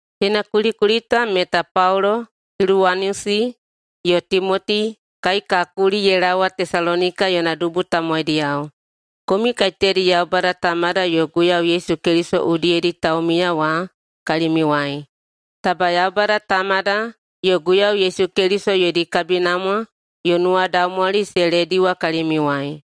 Teina kulikuli ta meta Paulo, Siluwanusi, yo Timoti, kai ka kuli ye laowa Tesalonika yona dubu tamowaidiyao, komiu kaiteyadi Yaubada Tamada yo Guiyau Yesu Keliso udiyedi taumiya wa kalimiuwai. Taba Yaubada Tamada yo Guiyau Yesu Keliso yodi kabinamwa yo nuwadaumwali se lediwa kalimiuwai.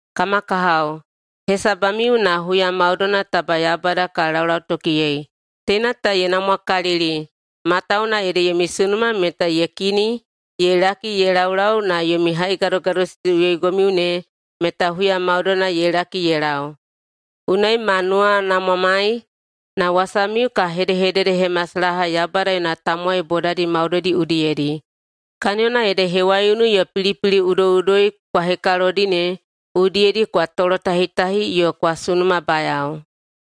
Kama kahao, hesabamiu na huya maudoina taba Yaubada ka laulautokiyei. Teina ta ye namwakalili matawuwuna ede yomi sunuma meta ye kini ye laki ye laulau na yomi haigadogadosisiꞌuyoigomiu ne meta huya maudoina ye laki ye lau. Unai ma nuwanamwamai na wasamiu ka hedehededehemasalaha Yaubada yona tamowai bodadi maudoidi udiyedi, kaniyona ede hewaiunu yo pilipili udoiꞌudoi kwa hekalodi ne udiyedi kwa tolotahitahi yo kwa sunumabayao.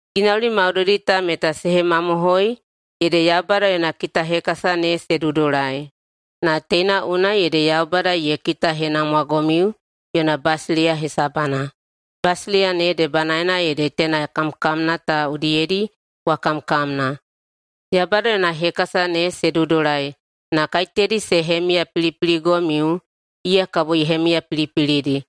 Ginauli maudoidi ta meta se hemamohoi ede Yaubada yona kitahekasa ne se dudulai, na teina unai ede Yaubada ye kitahenamwagomiu yona basileiya hesabana. Basileiya ne debanaena ede teina kamkamna ta udiyedi kwa kamkamna. Yaubada yona hekasa ne se dudulai, na kaiteyadi se hemiyapilipiligomiu, iya kabo ye hemiyapilipilidi,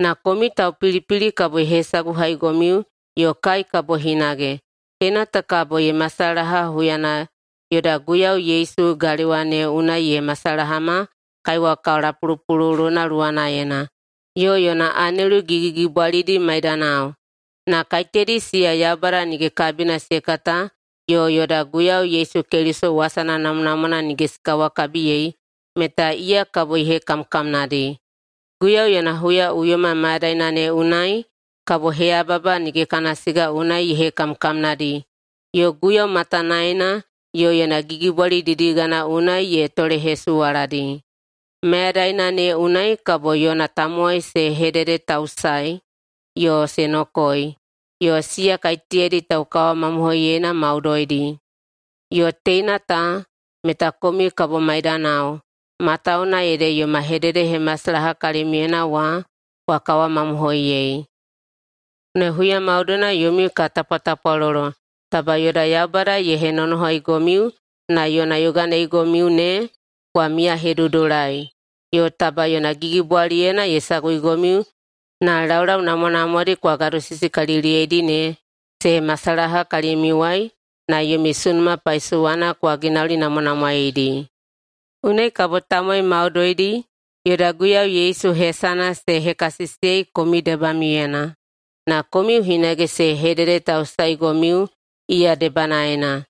na komiu taupilipili kabo ye hesaguhaigomiu yo kai kabo hinage. Teina ta kabo ye masalaha huyana yoda Guiyau Yesu galewa ne unai ye masalahama kaiwa kalapulupululuna luwanaena, yo yona anelu gigigigibwalidi maidanao. Na kaiteyadi siya Yaubada nige kabina se kata yo yoda Guiyau Yesu Keliso wasana namwanamwana nige se kawakabiyei meta iya kabo ye hekamkamnadi. Guiyau yona huyaꞌuyoma mayadaina ne unai kabo heyababa nige kana siga unai ye hekamkamnadi yo Guiyau matanaena yo yona gigibwali didigana unai ye tolehesuwaladi. Mayadaina ne unai kabo yona tamowai se hededetausaei yo se nokoei, siya kaiteyadi taukawamamohoiyeina maudoidi. Yo teina ta meta komiu kabo maidamiyao, matawuwuna ede yoma hededehemasalaha kalimiuyena wa kwa kawamamohoiyei. Unai huya maudoina yomiu ka tapwatapwalolo taba yoda Yaubada ye henonohaigomiu na yona yoganeigomiu ne kwa miyahedudulai, yo taba yona gigibwaliyena ye saguigomiu na laulau namwanamwadi kwa gadosisikaliliyeidi ne se masalaha kalimiuwai na yomi sunuma paisowana kwa ginaulinamwanamwaeidi. Unai kabo tamowai maudoidi yoda Guiyau Yesu hesana se hekasisiyei komiu debamiuyena, na komiu hinage se hededetausaeigomiu iya debanaena.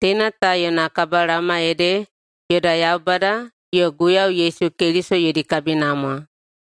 Teina ta yona kabalaoma ede yoda Yaubada yo Guiyau Yesu Keliso yodi kabinamwa.